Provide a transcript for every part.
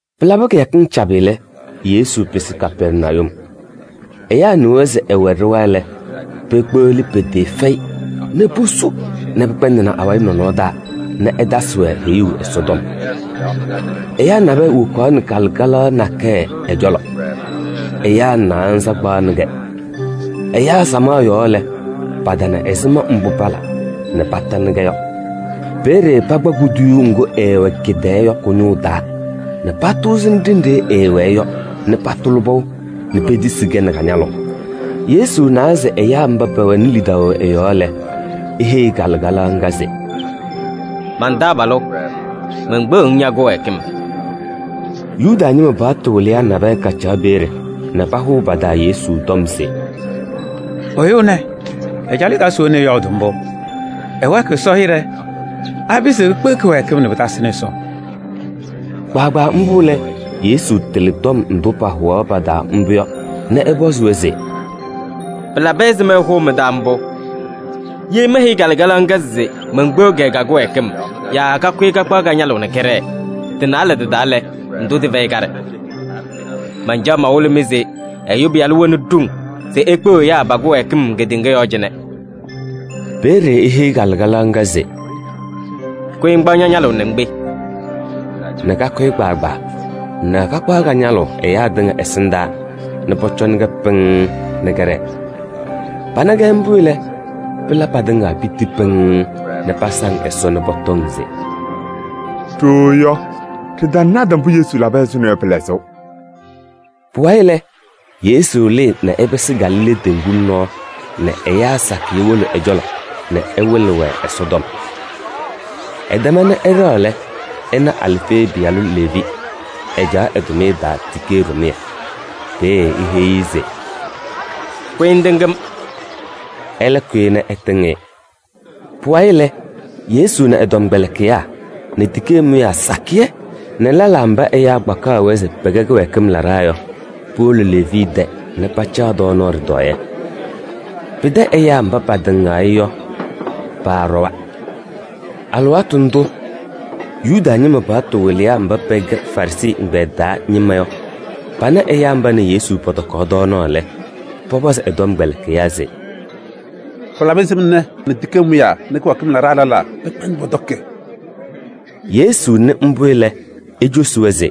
Pɩlabɩ kɩyakɩŋ cabɩ lɛ, Yesu pɩsɩ Kapɛrnayum. Ɛyaa nɩwa se ɛwɛ ɖɩɣa lɛ, pekpeɣli pɩtɩɩfɛyɩ nɛ posu nɛ pɩkpɛndɩnɩ awayɩ nɔnɔɔ taa nɛ ɛtasɩ-wɛ heyuu Ɛsɔtɔm. Ɛyaa nabɛyɛ wokaɣnɩ kalɩkalaɣ nakɛyɛ ɛ-cɔlɔ. Ɛyaa naanza kpaɣnɩ-kɛ. Ɛyaa samaɣ yɔɔ lɛ, patana ɛzɩma mbʋ pala nɛ patanɩ-kɛ yɔ. Peeye pakpa kuduyuu ŋgʋ ɛɛwɛ kɩ-tɛɛ yɔ kʋ-ñʋʋ taa nɛ patʋʋzɩnɩ ɖenɖe ɛɛwɛɛ yɔ nɛ patʋlɩ pɔʋ nɛ petisi-kɛ nɛ ka-ñalʋʋ. Yesu nawa se ɛyaa mba pɛwɛnɩ lidaʋ ɛ-yɔɔ lɛ, eheyi kalɩkalaɣ ŋga se: “Man-taabalʋ! Menkpeɣ-ŋ ña-kɩwɛɛkɩm.” Yuda ñɩma paɣtʋ wɩlɩyaa nabɛyɛ kacaɣ peeye nɛ pahʋʋ pa-taa Yesu tɔm se: “Ɛyʋ ɛnɛ ɛcalɩ ɛ-taa se we nɛ ɛyɔɔdʋʋ mbʋ? Ɛwɛɛkɩɣ Ɛsɔ hɩɖɛ! Apɩzɩɣ ekpeɣ kɩwɛɛkɩm nɛ pɩtasɩnɩ Ɛsɔ?” Kpaagbaa mbʋ lɛ, Yesu tɩlɩ tɔm ndʋ pahʋwaɣ pa-taa mbʋ yɔ nɛ ɛpɔzɩ-wɛ se: “Pɩlabɩ ɛzɩma ɩhʋʋ mɩ-taa mbʋ? Ye meheyi kalɩkalaɣ ŋga se menkpeɣ-kɛ ka-kɩwɛɛkɩm yaa kakʋyɩ kakpaɣ ka-ñalʋʋ nɛ kɛɖɛɛ, tɩ-naalɛ tɩ-taa lɛ, ndʋ tɩfɛyɩ kaɖɛ? Mancaɣ mawɩlɩ-mɩ se Ɛyʋ Pɩyalʋ wɛnɩ ɖoŋ se ekpeɣ ɛyaa pa-kɩwɛɛkɩm kedeŋa yɔɔ cɩnɛ.” Peeye eheyi kalɩkalaɣ ŋga se: “Ña! Kʋyɩ ŋkpaɣ ña-ñalʋʋ nɛ ŋkpe” nɛ kakʋyɩ kpaagbaa nɛ kakpaɣ ka-ñalʋʋ ɛyaa tɩŋa ɛsɩndaa nɛ pɔcɔnɩ-kɛ pɩŋŋ nɛ kɛɖɛɛ. Pana-kɛ mbʋ lɛ, pɩla patɩŋa piti pɩŋŋ nɛ pasaŋ Ɛsɔ nɛ pɔtɔŋ se: “Ɖooo yɔ, ɖɩtanata mbʋ Yesu labɩ ɛzʋnɔ yɔ pɩ-lɛzʋʋ.” Pʋwayɩ lɛ, Yesu lɩɩ nɛ ɛpɩsɩ Galilee teŋgu nɔɔ nɛ ɛyaa sakɩyɛ wolo ɛ-cɔlɔ nɛ ɛwɩlɩ-wɛ Ɛsɔtɔm. Ɛtɛma nɛ ɛɖɛɣ lɛ, ɛna Alfee pɩyalʋ Leevi, ɛcaɣ ɛ-tʋmɩyɛ taa tikee ɖɩmʋyɛ. Peeye eheyi-i se: “Kʋyɩ ŋtɩŋ-m!” Ɛlɛ kʋyɩ nɛ ɛtɩŋ-ɩ. Pʋwayɩ lɛ, Yesu nɛ ɛ-tɔmkpɛlɩkɩyaa nɛ tikee mʋyaa sakɩyɛ nɛ lɛlaa mba ɛyaa kpakaɣ-wɛ se pɛkɛ kɩwɛɛkɩm laɖaa yɔ, powolo Leevi tɛ nɛ pacaɣ tɔɔnaɣ ɖɩtɔɔyɛ. Pɩtɛ ɛyaa mba patɩŋaɣ-ɩ yɔ, paaɖɔwa. Alɩwaatʋ ndʋ Yuda ñɩma paɣtʋ wɩlɩyaa mba pɛkɛ Farɩsɩ ɛgbɛyɛ taa ñɩma yɔ pana ɛyaa mba nɛ Yesu pɔtɔkaɣ tɔɔnaɣ lɛ, pɔpɔzɩ ɛ-tɔmkpɛlɩkɩyaa se: “Pɩlabɩ ɛzɩma ɛ nɛ tikee mʋyaa nɛ kɩwɛɛkɩm laɖaa pɛkpɛndɩɣ pɔtɔkɩ?” Yesu nɩ mbʋ lɛ, ecosi-wɛ se: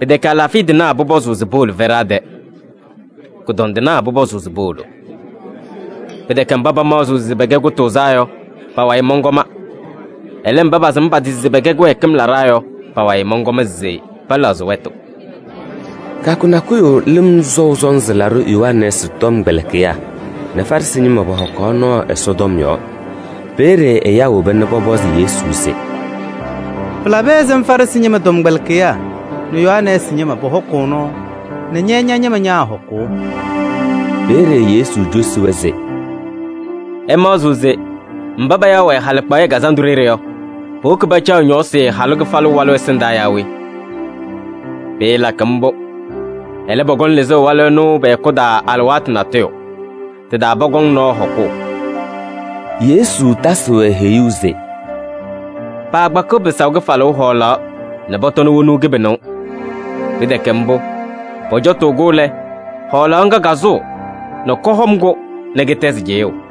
“Pɩtɛkɛ alaafɩya tɩnaa pʋpɔzʋʋ se powolo fɛɖaa tɛ, kʋdɔndɩnaa pʋpɔzʋʋ se powolo. Pɩtɛkɛ mba pamaɣzɩɣ se pɛkɛ kʋtʋʋzaa yɔ, pa-wayɩ mɔnkɔma. Ɛlɛ, mba pasɩm pa-tɩ se pɛkɛ kɩwɛɛkɩm laɖaa yɔ, pa-wayɩ mɔnkɔm se pɛlɛɣzɩ wɛtʋ.” Kɩyakʋ nakʋyʋ Lɩm Sɔʋ Sɔnzɩ Laɖʋ Yohanɛɛsɩ tɔmkpɛlɩkɩyaa nɛ Farɩsɩ ñɩma pɔhɔkaɣ nɔɔ Ɛsɔtɔm yɔɔ. Peeye ɛyaa woba nɛ pɔpɔzɩ Yesu se: “Pɩlabɩ ɛzɩma Farɩsɩ ñɩma tɔmkpɛlɩkɩyaa nɛ Yohanɛɛsɩ ñɩma pɔhɔkʋʋ nɔɔ nɛ ña-ñɩma ñaahɔkʋʋ?” Peeye Yesu cosi-wɛ se: “Ɩmaɣzɩɣ se mba payaɣ-wɛ halɩkpaɣyɛ kazandʋ ɖeɖe yɔ, powoki pacaɣ ñɔɔsɩ halʋ kɩfalʋ walʋ ɛsɩndaa yaa we? Pɩɩlakɩ mbʋ. Ɛlɛ, pɔkɔŋ lɩzʋʋ walʋ ɛnʋ pɛ-hɛkʋ taa alɩwaatʋ natʋyʋ. Tɩ-taa pɔkɔŋ nɔɔ hɔkʋʋ.” Yesu tasɩ-wɛ heyuu se: “Paakpakɩɣ pɩsaʋ kɩfalʋʋ hɔɔlaɣ nɛ pɔtɔnɩ wonuu kɩbɩnʋʋ. Pɩtɛkɛ mbʋ, pɔcɔtʋʋ-kʋ lɛ, hɔɔlaɣ ŋga kasʋʋ nɛ kɔhɔm-kʋ nɛ kɩtɛzɩ cɩyʋʋ.”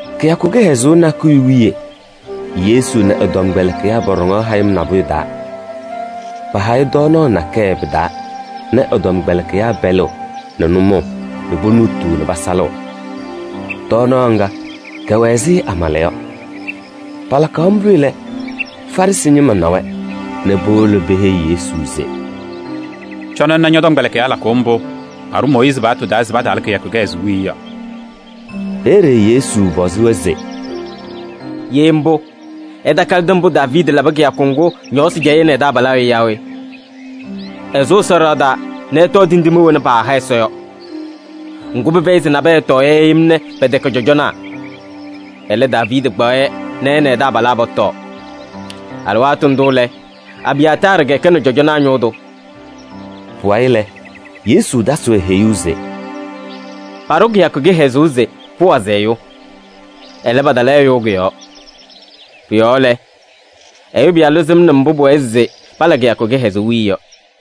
Kɩyakʋ kɩhɛzʋʋ nakʋyʋ wiye Yesu nɛ ɛ-tɔmkpɛlɩkɩyaa pɔɖɔŋaɣ hayɩm nabʋyʋ taa. Pahayɩ tɔɔnaɣ nakɛyɛ pɩ-taa nɛ ɛ-tɔmkpɛlɩkɩyaa pɛlɩɣ nɛ nʋmɔʋ nɛ ponuutuu nɛ pasalɩɣ. Tɔɔnaɣ ŋga, kɛwɛ ɛzɩ amala yɔ. Palakaɣ mbʋ lɛ, Farɩsɩ ñɩma na-wɛ nɛ powolo peheyi Yesu se: “Cɔnɩ ŋna ñɔ-tɔmkpɛlɩkɩyaa lakʋʋ mbʋ paɖʋ Mooyiizi paɣtʋ taa se pataala kɩyakʋ kɩhɛzʋʋ wiye yɔ.” Peeye Yesu pɔzɩ-wɛ se: “Ye mbʋ, ɩtakalɩdɩ mbʋ Daaviidi labɩ kɩyakʋ ŋgʋ ñɔɔsɩ cɛyɩ ɛ nɛ ɛ-taabalaa yɔ yaa we? Ɛsʋ Ɛsɔ ɖɩɣa taa nɛ ɛtɔɔ tindine wena paaha Ɛsɔ yɔ. Ŋgʋ, pɩfɛyɩ se nabɛyɛ ɛtɔɔ-yɛ yem nɛ pɛtɛkɛ cɔjɔnaa. Ɛlɛ, Daaviidi kpaɣ-yɛ nɛ ɛ nɛ ɛ-taabalaa pɔtɔɔ. Alɩwaatʋ ndʋ lɛ, Abiyaataarɩ kɛkɛnɩ cɔjɔnaa ñʋʋ tʋ.” Pʋwayɩ lɛ, Yesu tasɩ-wɛ heyuu se: “Paɖʋ kɩyakʋ kɩhɛzʋʋ se pʋwazɩ ɛyʋ. Ɛlɛ, patala ɛyʋ kʋ-yɔɔ. Pʋ-yɔɔ lɛ, Ɛyʋ Pɩyalʋ sɩmnɩ mbʋ pʋwɛɛ se pala kɩyakʋ kɩhɛzʋʋ wiye yɔ.”